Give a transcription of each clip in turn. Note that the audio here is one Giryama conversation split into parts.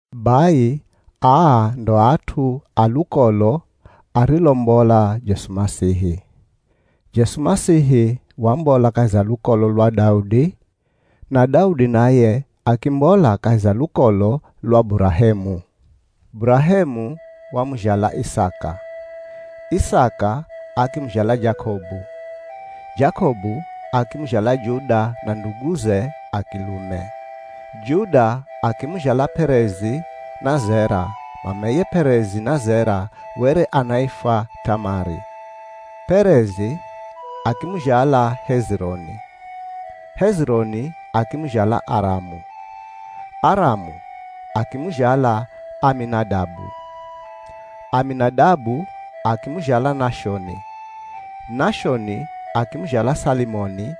Bai aa ndo at'u a lukolo arilombola Jesu Masihi. Jesu Masihi wambola kahi za lukolo lwa Daudi, na Daudi naye akimbola kahi za lukolo lwa Burahemu. Burahemu wamuzhala Isaka. Isaka akimuzhala Jakobu. Jakobu akimuzhala Juda na nduguze a kilume. Juda akimuzhala P'erezi na Zera (mameye P'erezi na Zera were anaifwa T'amari). P'erezi, akimuzhala Hezironi. Hezironi, akimuzhala Aramu. Aramu, akimuzhala Aminadabu. Aminadabu, akimuzhala Nashoni. Nashoni akimuzhala Salimoni,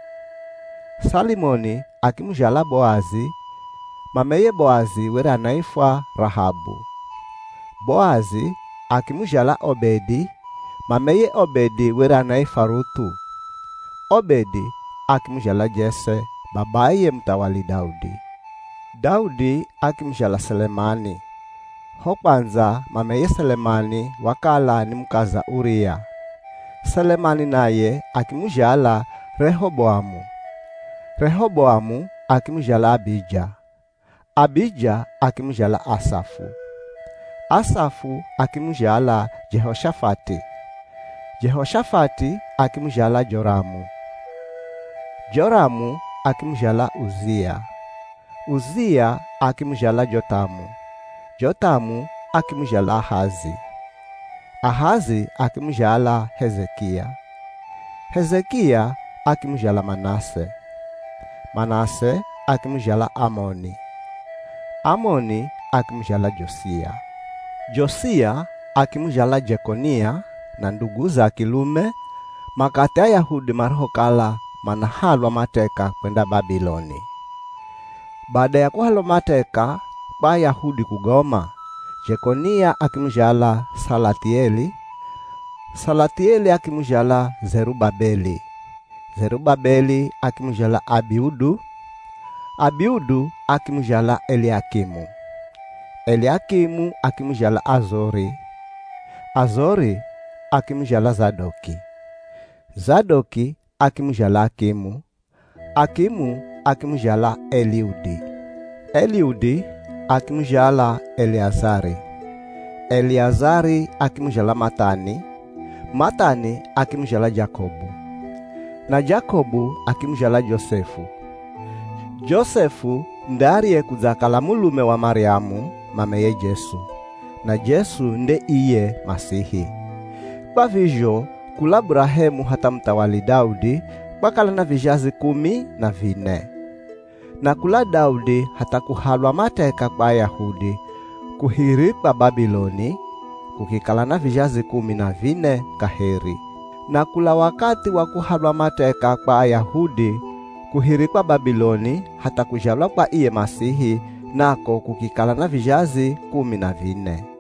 Salimoni akimuzhala Boazi (mameye Boazi were anaifwa Rahabu). Boazi, akimuzhala Obedi (mameye Obedi were anaifwa Ruth'u). Obedi, akimuzhala Jese, babaye muthawali Daudi. Daudi akimuzhala Selemani, (ho kwandza mameye Selemani wakala ni mukaza Uria). Selemani naye akimuzhala Rehoboamu. Rehoboamu akimuzhala Abija. Abija akimuzhala Asafu. Asafu akimuzhala Jehoshafati. Jehoshafati akimuzhala Joramu. Joramu akimuzhala Uzia. Uzia akimuzhala Jothamu. Jothamu akimuzhala Ahazi. Ahazi akimuzhala Hezekia. Hezekia akimuzhala Manase. Manase akimuzhala Amoni. Amoni akimuzhala Josia. Josia akimuzhala Jekonia na nduguze a kilume makathi Ayahudi marihokala manahalwa mateka kwenda Babiloni. Bada ya kuhalwa mateka kwa Ayahudi kugoma, Jekonia akimuzhala Salathieli. Salathieli akimuzhala Zerubabeli. Zerubabeli akimuzhala Abiudu. Abiudu akimuzhala Eliakimu. Eliakimu akimuzhala Azori. Azori, akimuzhala Zadoki. Zadoki akimuzhala Akimu. Akimu akimuzhala Eliudi. Eliudi akimuzhala Eliazari. Eliazari akimuzhala Mathani. Mathani akimuzhala Jakobu. Na Jakobu akimuzhala Josefu. Josefu nde ariyekudzakala mulume wa Maryamu, mameye Jesu. Na Jesu nde iye Masihi. Kwa vizho kula Burahemu hatha muthawali Daudi, kwakala na vizhazi kumi na vine. Na kula Daudi hatha kuhalwa mateka kwa Ayahudi kuhirikwa Babiloni, kukikala na vizhazi kumi na vine kaheri. Na kula wakathi wa kuhalwa mateka kwa Ayahudi kuhirikwa Babiloni hatha kuzhalwa kwa iye Masihi, nako kukikala na vizhazi kumi na vine.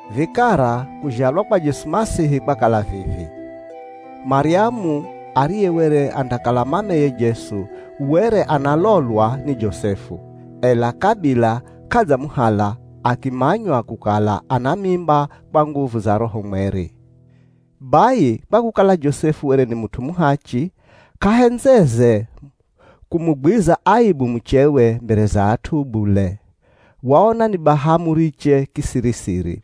Vikara kuzhalwa kwa Jesu Masihi kwakala vivi: Maryamu ariye were andakala mameye Jesu were analolwa ni Josefu, ela kabila k'adzamuhala, akimanywa kukala ana mimba kwa nguvu za Roho Mweri. Bai kwa kukala Josefu were ni mut'u muhachi k'ahendzeze kumugwiza aibu muchewe mbere za at'u bule, waona ni baha amuriche kisiri-siri.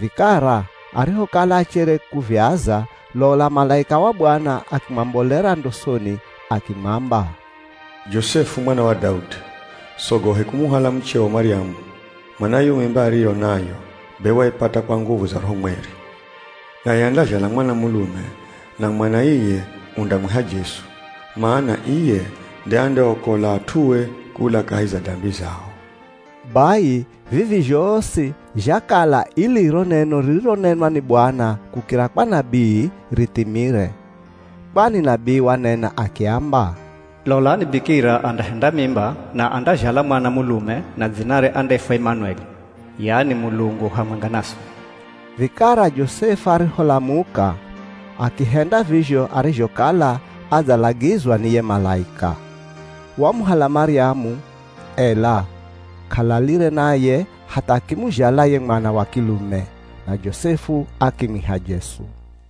Vikara arihokala achere kuviaza, lola malaika wa Bwana akimwambolera ndosoni akimwamba, “Josefu mwana wa Daudi, sogohe kumuhala mucheo Maryamu, mana yo mimba ariyo nayo be waipata kwa nguvu za Roho Mweri. Naye andazhala mwana mulume, na mwana iye undamwiha Jesu, mana iye nde andeaokola at'ue kula kahi za dambi zao.” Bai vivi zhosi zhakala ili ro neno ririronenwa ni Bwana kukira kwa nabii rithimire. Kwani nabii wanena akiamba, “Lolani, bikira andahenda mimba na andazhala mwana mulume na dzinare andaifwa Imanueli, yani Mulungu hamwenga naswi.” Vikara Josefu ariholamuka, akihenda vizho arizhokala adzalagizwa ni ye malaika. Wamuhala Maryamu, ela k'alalire naye hatha akimuzhala ye mwana wa kilume. Na Josefu akimwiha Jesu.